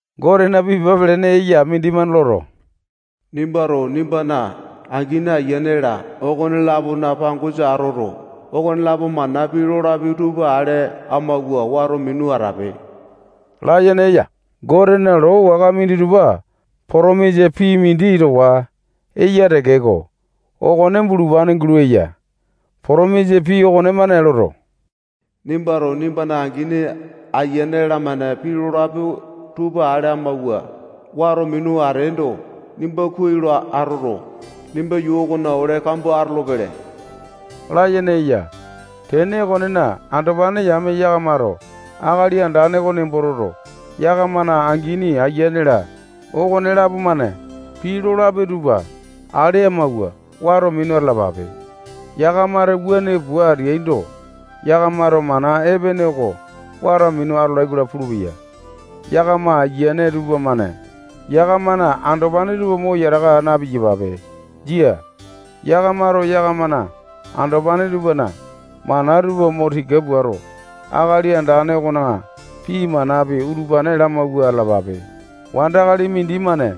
Gotena pii pepa pelene eya mindimane loto, nimbato nimbana angini, aiyane-la, okone-lapona pangosa atoto, okonelapo-mane pii lolapi tupa ale amawua, wato minu atape layene eya. Gotena loo waka minditupa potomisa pii mindi towa eya tekeko, okone bulupane gulo eya. Potomisa pii okonemane loto, nimbato nimbana angini, ayiane-lamane pii lolapi tupa ale amawua, wato minu ateendo, nimba kuai lo atoto, nimba yuu okona ole kambua lo atolopele layene eya. Tene okonena, andopane yame yakamato Akali Andane oko nembo toto, yakamana angini, aiyane-la, okonelapo-mane pii lolapi tupa ale amawua wato minu atalalape. Yakamato wuane pua ateaindo, yakamato mana epene oko wato minu atolai-kola pulupeya. Yakama ayiane tupamane yakamana andopane tupa mo yataka aa na-piyapape. Jia. Yakamato yakamana andopane tupana mana tupa mo tika puato, Akali Andane okona pii manapi, utupane lamawua atalapape. Wandakali mindimane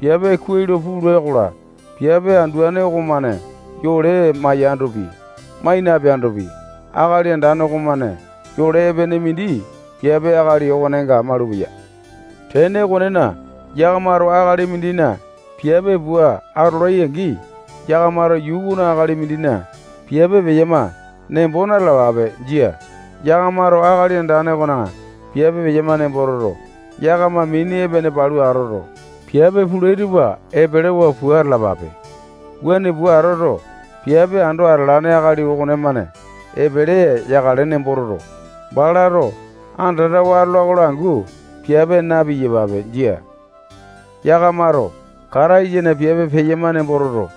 piape kuai lo pula-kola, piape anduane okomane yole maiyandopi, mai napeandopi, Akali Andane okomane yole epene mindi piape wandakali okonenga malupeya. Tene okonena, yakamato akali mindina piape pua atolai-angi, yakamato yuu okona akali mindina piape peyama nembo na-talapape. Jia. Yakamato Akali Andane okona piape peyama nembo toto, yakama mini epene palu atoto, piape pulai tupa epelewa pua atalapape. Wuane pua atoto, piape ando atalane akali okonemane epele yakale nembo toto, balato andatawa atolai-kola angu, piape na-piyapape. Jia. Yakamato Kataisana piape peyama nembo toto,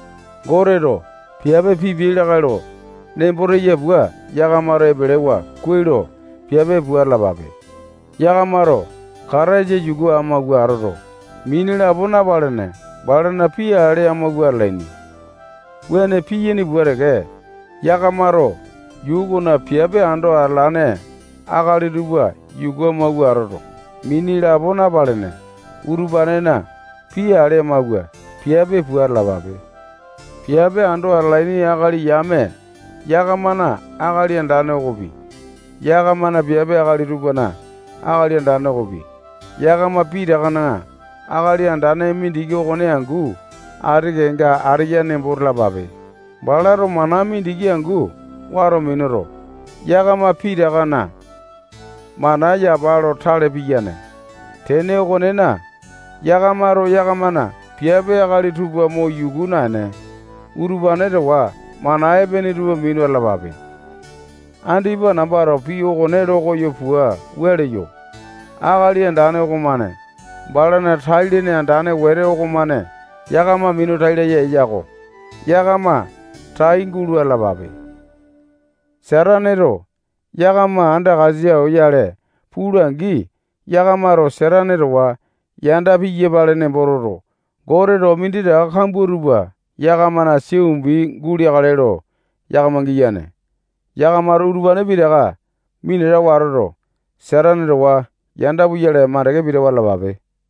Goteto piape pipiai lakae lo nembo teya pua, yakamato epelewa kuai lo piape pua atalapape. Yakamato Kataisa yuku amawua atoto, mini lapo napalene, balana pii ale amawua atalaini. Wuane piyaini pua teke, yakamato yuu okona piape ando atalane akali tupa yuku amawua atoto, mini lapo napalene, utupanena pii ale amawua, piape pua atalapape. Piape ando atalaini akali yame yakamana Akali Andane okopi, yakamana piape akali tupana Akali Andane okopi, yakama pitakana Akali Andane mindiki okone angu ati kenga ateya nembo talapape. Balato mana mindiki angu wato minuto, yakama pitakana mana yapa lo tale piyane. Tene okonena, yakamato yakamana piape akali tupa mo yuku naene, utupane towa mana epene tupa minu atalapape. Andipa nambato pii okone lo koyo pua wua leyo. Akali Andane okomane balana tai-lene andane wete okomane yakama minu tai laya eya-ko. Yakama tai gulo atalapape. Sataneto yakama andakasa oyale pula-angi, yakamato Satane towa yanda piyapale nembo toto, Goteto minditaka kambua tupa yakamana sia umbi guleakale lo yakama giyane. Yakamato utupane pitaka minatawa atoto, Satane towa yanda puyale mandeke pitawa atalapape.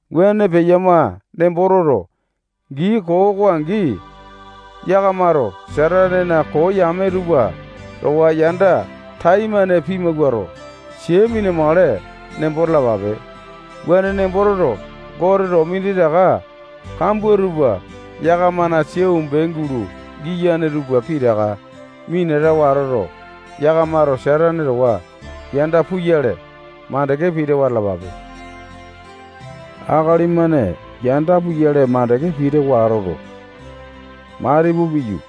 Wuane peyama nembo toto, gii koo oko angi, yakamato Satanena koo yame tupa towa yanda taimane pimawuato, sia mina-makale nembo talapape. Wuane nembo toto, Goteto minditaka kambua tupa yakamana sia umbi gulo giyane tupa pitaka minatawa atoto, yakamato Satane towa yanda puyale mandeke pitawa atalapape. Akali-mane yanda puyale makande pitawa atoto, matipu piyu,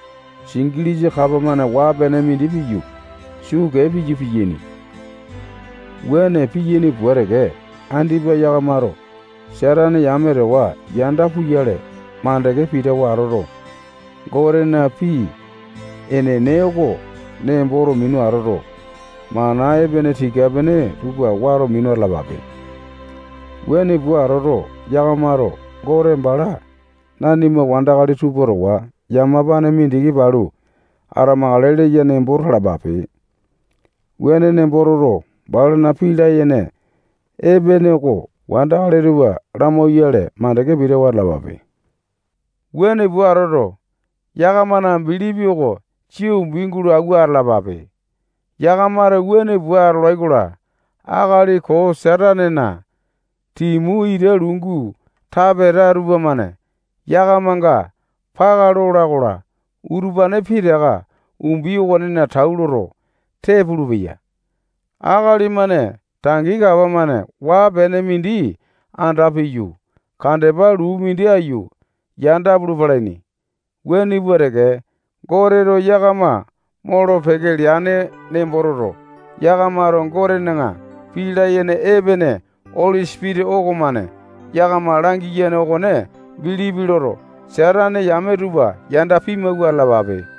singilisa kapa-mane waa-pene mindi piyu, suu kee piyu, piyaini. Wuane piyaini pua teke, andipa yakamato Satane yame towa yanda puyale makande pitawa atoto, Gotena pii enene oko nemboto minu atoto, mana epene tika-pene tupa wato minu atalapape. Wuane pua atoto, yakamato Gote bala nanima wandakali tupa towa yamapane mindiki palu atamakale leya nembo talapape. Wuane nembo toto, balana pii layene epene oko wandakali tupa lamauyale, makande pitawa atalapape. Wuane pua atoto, yakamana bilipi oko sia umbi gulo awua atalapape. Yakamato wuane pua atolai-kola, akali koo Satanena timu ita lungu tapeta tupamane yakamanga paka lola-kola, utupane pitaka umbi okonena tau loto, tee pulupeya. Akali-mane tangi kapa-mane waa-pene mindi anda piyu, kandepa luu mindi aiyu, yanda pulu palaini. Wuane pua teke, Goteto yakama molo-peke leane nembo toto, yakamato Gotena pii layene epene Oli Sipitisa okomane yakama langiyane okone bilipi loto, Satane yame tupa yanda pimawua atalapape.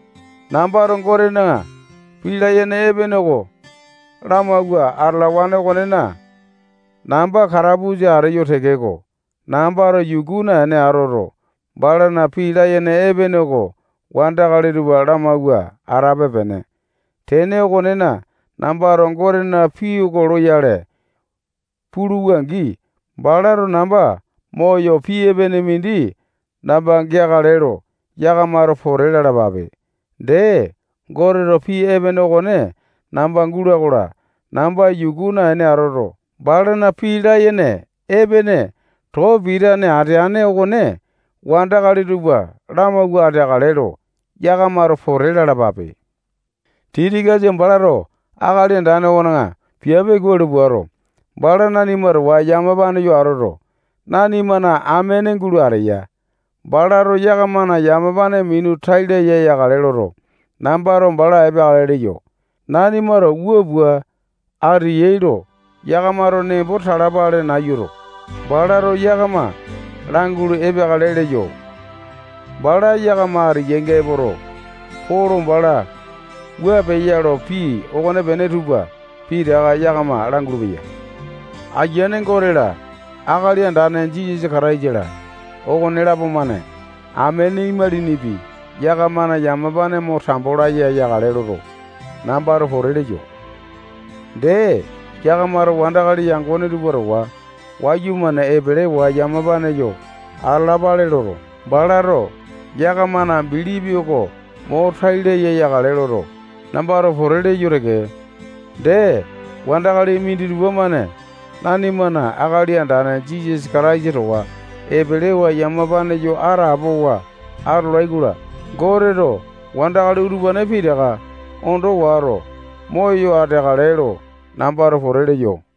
Nambato Gotena pii layene epene oko lamawua atalawane okonena, namba katapusa ateyo tekeko, nambato yuku naene atoto, balana pii layene epene oko wandakali tupa lamawua atape-pene. Tene okonena, nambato Gotena pii oko loyale puluwa-angi, balato namba moyo pii epene mindi namba geakale lo yakamato pote lalapape. Dee, Goteto pii epene okone namba gula-kola, namba yuku naene atoto, balana pii layene epene too pitane ateane okone wandakali tupa lamawua ateakale lo yakamato pote lalapape. Tikikasa balato Akali Andane okona piape kuai lo puato, bala nanima towa yamapane yo atoto, nanimana amene gulo ateya. Balato yakamana yamapane minu tai laya yakale loto, nambato bala epeakale leyo. Nanimato wua pua ateyai lo yakamato nembo talapale nayuto, balato yakama langulu epeakale leyo. Bala yakama ateyainga epoto, Polo bala wua peya lo, pii okonepene tupa pitaka yakama langulu-peya. Ayiane Gote-la, Akali Andane Jisasa Kataisa-la, okonelapo-mane amene imalinipi yakamana yamapane mo tambo laya yakale loto, nambato pote leyo. Dee, yakamato wandakali yangone tupa towa wayumane epelewa yamapane yo atalapale loto, balato yakamana bilipi oko mo tai laya yakale loto, nambato pote leyo teke. Dee, wandakali minditupa-mane nanimana Akali Andane Jisasa Kataisa towa epelewa yamapane yo atapowa atolai-kola, Goteto wandakali utupane pitaka ondo wato, moyo ateakale lo nambato pote leyo.